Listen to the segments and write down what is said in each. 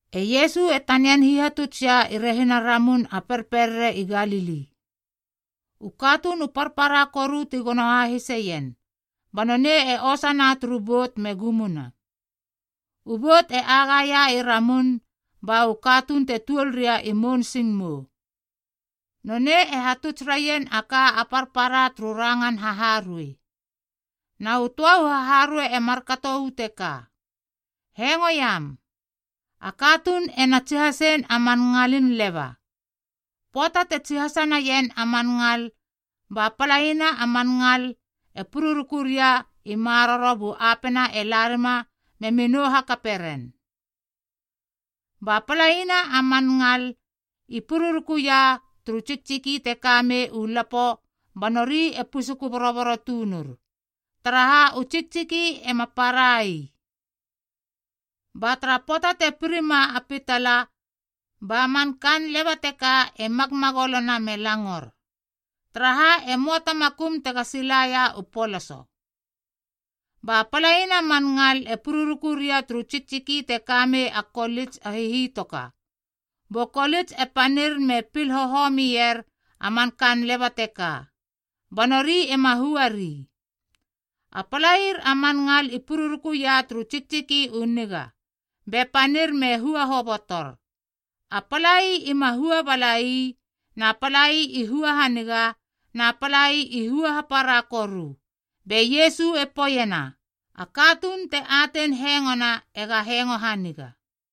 E Iesu e tanian hihatuts ia i rehina Ramun a Perperere i Galili. U katuun u parpara koru ti gono hahiseien, ba nonei e osana turu bout me gumuna. U bout e agaia i ramun ba u katuun te tuol ria i mounsingmou. Nonei e hatuts raien a ka a parpara turu rangan haharuei. Na u töa u haharuei e markato uu teka: “Hengoiam. A katuun ena tsihasein a man ngalin leba. Pöata te tsihasa naien a man ngal ba palaina a man ngal e pururuku ria i maroro bu apena e la rima memi nou hakape ren. Ba palaina a man ngal i pururuku ia turu tsiktsiki te ka mei u lapo ba nori e pusuku boroboro tunur, taraha u tsiktsiki ema para ii. Ba tara pöata te pirima a pitala, ba man kaan leba teka e magmagolona me langor, taraha e möa ta makum tega silaia u poloso. Ba palaina a man ngal e pururuku ria turu tsiktsiki te ka mei a kolits a hihitoka, bu kolits e panir me pil hohomier a man kaan leba teka, ba nori ema hua ri. A palair a man ngal i pururukuia turu tsiktsiki u niga be panir me hua hobotor. A palai ima hua balai, na palai i hua haniga, na palai i hua hapara koru.” Be Iesu e poeiena, “A katuun te atein hengona ega hengo haniga.”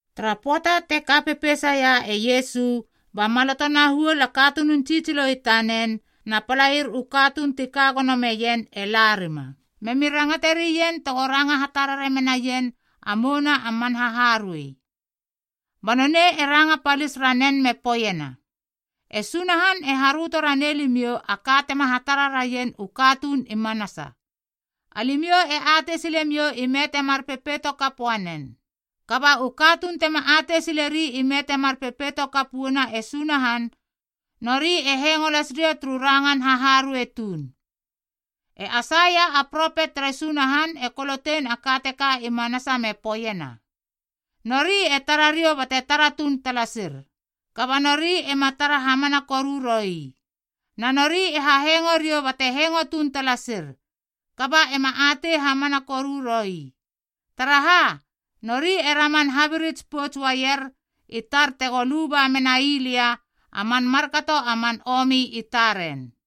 Tara pöata te ka pepeisaia e Iesu ba maloto na huol a katunun tsitsilo i tanen na palair u katuun ti ka gono meien e larima, memi rangate rien tego ranga hatarare menaien a mouna a man haharuei. Ba nonei e ranga palis ranen me poeiena, “E Sunahan e haröto ranei limiou a ka tema hatara raien u katuun i manasa. Alimiou e atei silemiou ime temar pepeito kap uanen. Kaba u katuun tema atei sileri ime temar pepeito kap uana e Sunahan, nori e hengo las ria turu rangan haharuei tuun. E Aisaia a propet tere Sunahan e kolotein a ka teka i manasa me poeiena, ‘Nori e tara riou bate tara tuun talasir, kaba nori ema tara hamana koru roi. Na nori e hahengo riou bate hengo tuun talasir, kaba ema atei hamana koru roi. Taraha, nori e raman habirits pouts uaier i tar tego luba menai lia a man markato a man omi i taren.’”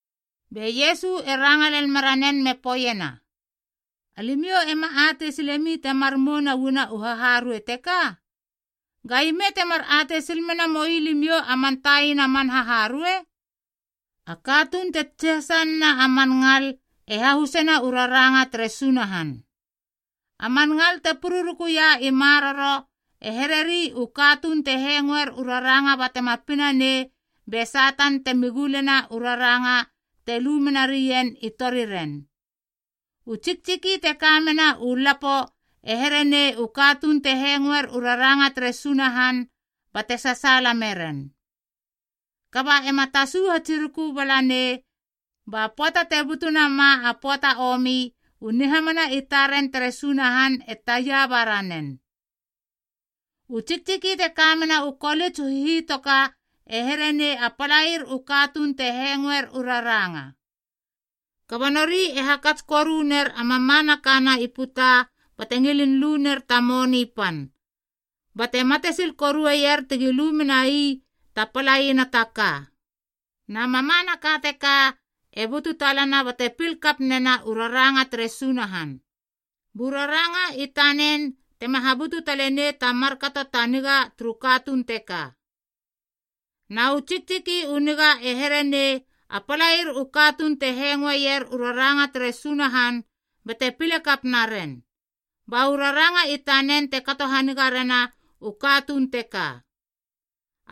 Be Iesu e ranga lel meranen me poeiena, “Alimiou ema atei sile mi temar mouna uana u haharuei teka? Ga ime temar atei sil mena moi limiou a man taina man haharuei? A katuun te tsihasa nena a man ngal e hahusena u raranga tere Sunahan. A man ngal te pururukuia i maroro e here ri u katuun te hengoer u raranga batema pina nei be Satan temi gulena u raranga te lu menarien i toriren. U tsiktsiki te ka mena u lapo e here nei u katuun te hengoer u raranga tere Sunahan bate sasaala meren. Kaba ema tasu hatsiruku bala nei ba pöata te butu nama a pöata a omi, u nihamana i taren tere Sunahan e taia ba ranen. “U tsiktsiki te ka mena u kolits u hihitoka e here nei a palair u katuun te hengoer u raranga. Kaba nori e hakats koru ner a mamanakana i puta bate ngilin lu ner ta moni pan, bate matesil koruer tegi lu menai ta palaina ta ka. Na mamanaka teka e butu talana bate pil kap nena u raranga tere Sunahan, bu raranga i tanen tema habutu talenei ta markato ta niga turu katuun teka. Na u tsiktsiki u niga e here nei a palair u katuun te hengoeier u raranga tere Sunahan bate pile kap naren, ba u raranga i tanen te kato haniga rena u katuun teka.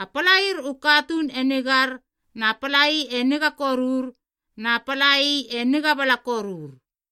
A palair u katuun e nigar, na palai e niga korur, na palai e niga bala korur.”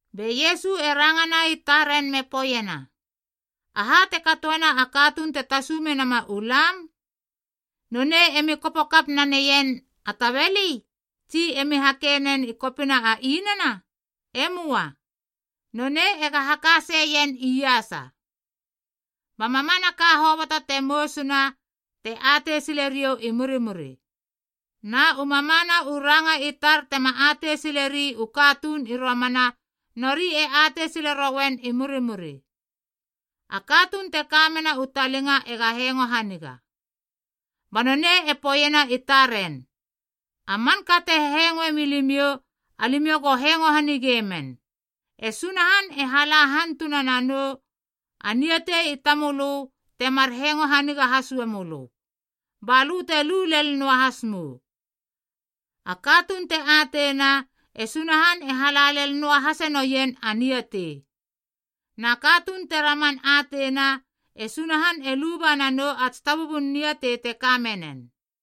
Be Iesu e rangana i taren me poeiena, “Aha te katoena a katuun te tasu menama u lam? Nonei emi kopo kap naneien a tabeli, tsi emi hakei nen i kopina a inana? E möa. Nonei ega hakaseien iasa. Ba mamanaka hoboto te mousuna, te atei sile riou i murimuri. Na u mamana u ranga i tar tema atei sile ri u katuun i romana, nori e atei sile rouen i murimuri. A katuun te kamena u talinga ega hengo haniga.” Ba nonei e poeiena i taren, “A manka te hengoe milimiou alimiou go hengo hanige men. E Sunahan e hala hantuna nanou a niatei i tamölö temar hengo haniga has uamölö, ba lö te lu lel noahas mou. A katuun te ateina, e Sunahan e hala lel noahase noien a niatei. Na katuun te raman ateina, e Sunahan e luba nanou a tsitabubun niatei te ka menen.”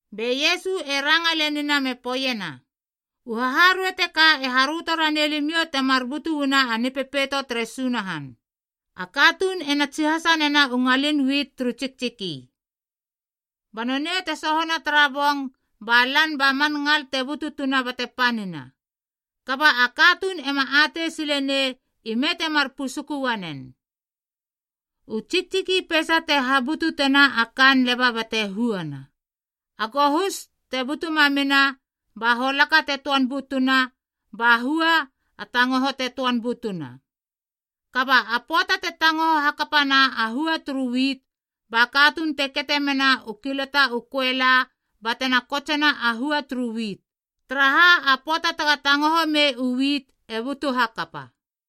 Be Iesu e ranga lenina me poeiena, “U haharuei teka e haröto ranei limiou temar butu uana a Nipepeito tere Sunahan. A katuun ena tsihasa nena u ngalin wit turu tsiktsiki. Ba nonei te sohona tara bong ba lan ba man ngal te bututuna bate panina, kaba a katuun ema atei silenei ime temar pusuku uanen. U tsiktsiki peisa te habututena a kaan leba bate huana, a gohus te butu mamina ba holaka te töan butuna ba hua a tangoho te töan butuna. Kaba a pöata te tangoho hakapana a hua turu wit ba katuun te kete mena u kilata u köela batena kotsena a hua turu wit, taraha a pöata tega tangohomei u wit e butu hakapa.”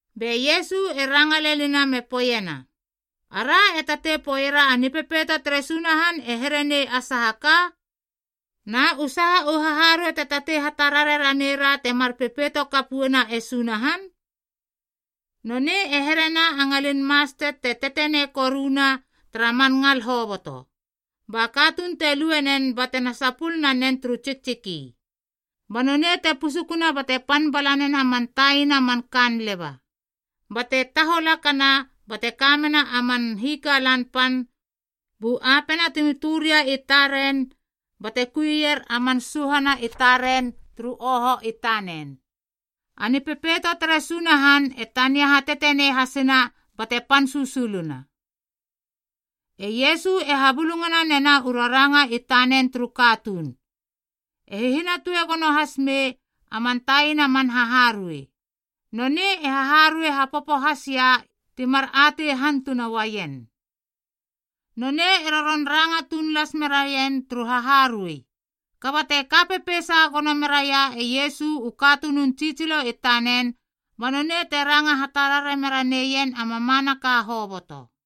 Be Iesu e ranga lenina me poeiena, “Ara e tatei poeiera a Nipepeito tere Sunahan e here nei a saha ka? Na u saha u haharuei te tatei hatarare ranera temar pepeito kap uana e Sunahan? Nonei e here nei a ngalin mastet te tetenei koruna tara man ngal hoboto. Ba katuun te lue nen batena sapul nanen turu tsiktsiki. Ba nonei te pusukuna bate pan bala nena man taiana man kaan leba. Bate taholakana bate kamena a man hikalan pan bu apena temi tö ria i taren bate kuieier a man suhana i taren turu uoho i tanen. Na Nipepeito tere Sunahan e tania hatetenei hasina bate pan susuluna.” E Iesu e habulungana nena u raranga i tanen turu katuun, e hihinatue gono has mei a man taina man haharuei. Nonei e haharuei hapopo has ia timar atei hantuna uaien. Nonei e roron ranga tuun las meraien turu haharuei. Kaba te ka pepeisa gono meraia e Iesu u katunun tsitsilo i tanen, ba nonei te ranga hatarare mera neien a mamanaka hoboto.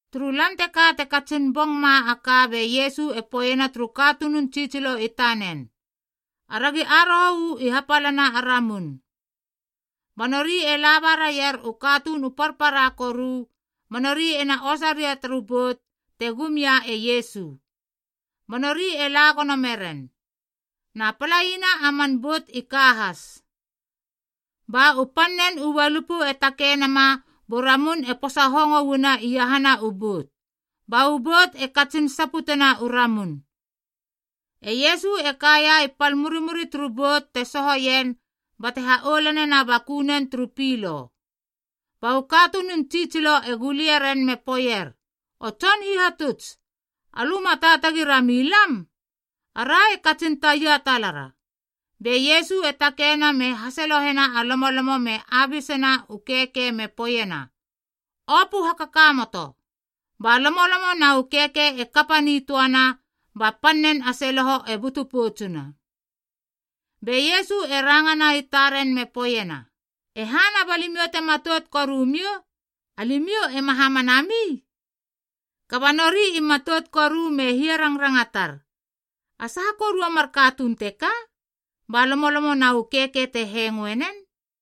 Turu lan teka te katsin bong ma a ka be Iesu e poeiena turu katunun tsitsilo i tanen, “Aragi aroho uu i hapalana a ramun.” Ba nori e laba raier u katuun u parpara koru, ba nori ena osa ria turu bout te gum ia e Iesu, ba nori e la gono meren. Na palaina a man bout i ka has. Ba u pan nen u ualupu e takei nama bu ramun e posa hongo uana iahana u bout, ba u bout e katsin saputena u ramun. E Iesu e kaia i pal murimuri turu bout te sohoien bate ha oulanena a bakunen turu pilo. Ba u katunun tsitsilo e gulie ren me poeier, “O Tson Hihatuts, alö ma taatagi rami lam? Ara e katsin taia talara.” Be Iesu e takeina me hasalohena a lomolomo me abisena u keikei me poeiena, “Opö hakakamoto.” Ba lomolomo na u keikei e kapa nitöana ba pan nen a seloho e butu poutsuna. Be Iesu e rangana i taren me poeiena, “E hana ba limiou te matout korumiou? Alimiou ema hamana mi?” Kaba nori i matout koru me hiarangrangatar, “A saha koru a mar katuun teka? Ba lomolomo na u keikei te hengoe nen.”